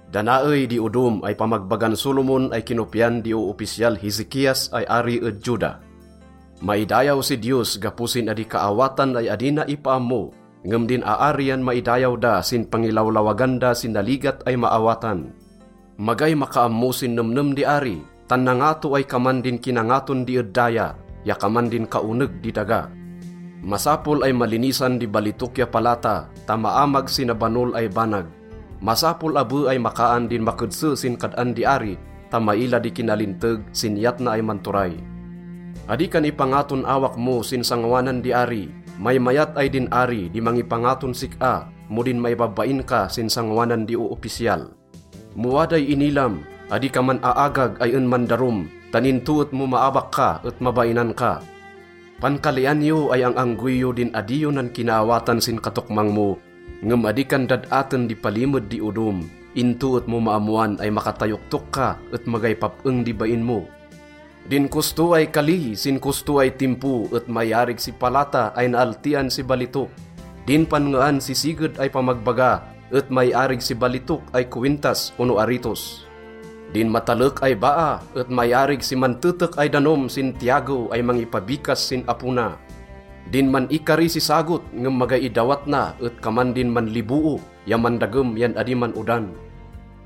Da naey di odom ay pamagbagan Solomon ay kinopyan di oopisyal Hezekias ay ari ed Juda. Maidayaw si Diyos gapo sin adi kaawatan ay adi na ipaammo, ngem din aari yan maidayaw da sin pangilawlawagan da si naligat ay maawatan. Magay makaammo sin nemnem di ari, tan nangato ay kaman din kinangaton di ed daya ya kaman din kaoneg di daga. Masapol ay malinisan di balitok ya palata ta maamag si nabanol ay banag. Masapol abe ay makaan din makedse sin kad-an di ari ta maila di kinalinteg sin iyat na ay manturay. Adi kan ipangaton awak mo sin sangoanan di ari. Maymayat ay din ari di mangipangaton sik-a mo din maibabain ka sin sangoanan di oopisyal. Mo waday inilam, adi ka man-aagag ay en mandarum tan into et mo maabak ka et mabainan ka. Pankalian yo ay ang-anggoy yo din adi yo nankinaawatan sin katokmang mo, ngem adi kan dad-aten di palimed di odom, into et mo maammoan ay makatayoktok ka et magay pap-eng di bain mo. Din kosto ay kali sin kosto ay timpo et maiarig si palata ay naaltian si balitok. Din panngean si siged ay pamagbaga et maiarig si balitok ay kowintas ono aritos. Din matalek ay baa et maiarig si mantetek ay danom sin tiyagew ay mangipabikas sin apo na. Din man-ikari si sagot ngem magay idawat na et kaman din manliboo ya mandagem yan adi man-odan.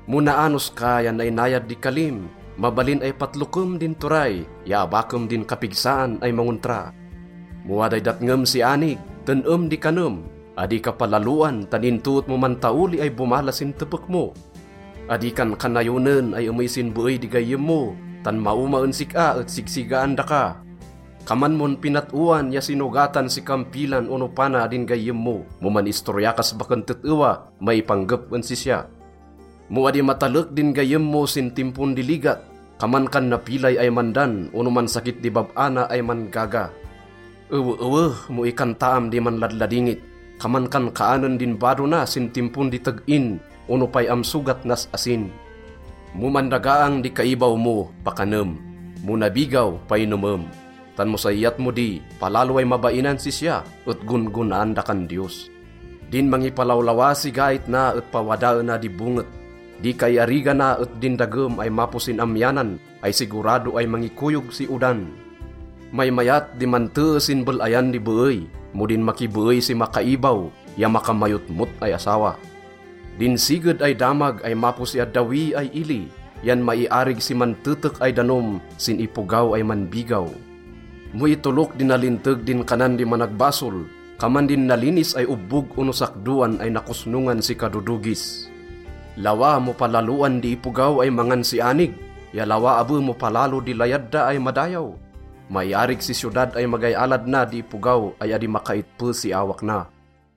Mo naanos ka ya nainayad di kalim, mabalin ay patlokem din turay ya abakem din kapigsaan ay mangontra. Mo waday datngem si anig, ten-em di kanem. Adi ka palaloan tan into et mo mantaoli ay bomala sin tepek mo. Adi kan kanayonen ay emey sin beey di gayyem mo tan maoma en sik-a et sigsigaan daka. Kaman mon pinat-oan ya sinogatan si kampilan ono pana din gayyem mo mo man-istorya kas baken tet-ewa maipanggep en sisya. Mo adi matalek din gayyem mo sin timpon di ligat, kaman kan napilay ay mandan ono mansakit di bab-a na ay man-gaga. Eweewe mo ikantaam di manladladingit. Kaman kan kaanen din bado na sin timpon di teg-in ono pay-am sogat nas asin. Mo mandagaang di kaibaw mo, pakanem; mo nabigaw, painomem. Tan mo say iyat mo di, palalo ay mabainan sisya, et gon-gonaan dakan Diyos. Din mangipalawlawa si gait na et pawadaena di bonget. Di kaiarigana et din dagem ay mapo sin amyanan ay sigurado ay mangikoyog si odan. Maymayat di mantee sin bel-ayan di beey mo din makibeey si makaibaw ya makamayotmot ay asawa. Din siged ay damag ay mapo si addawi ay ili yan maiarig si mantetek ay danom sin ipogaw ay manbigaw. Mo itolok di nalinteg din kanan di managbasol, kaman din nalinis ay obbog ono sakdoan ay nakosnongan si kadodogis. Lawa mo palaloan di ipogaw ay mangan si anig ya lawa abe mo palalo di layad da ay madayaw. Maiarig si siyodad ay magay alad na di ipogaw ay adi makaitpe si awak na.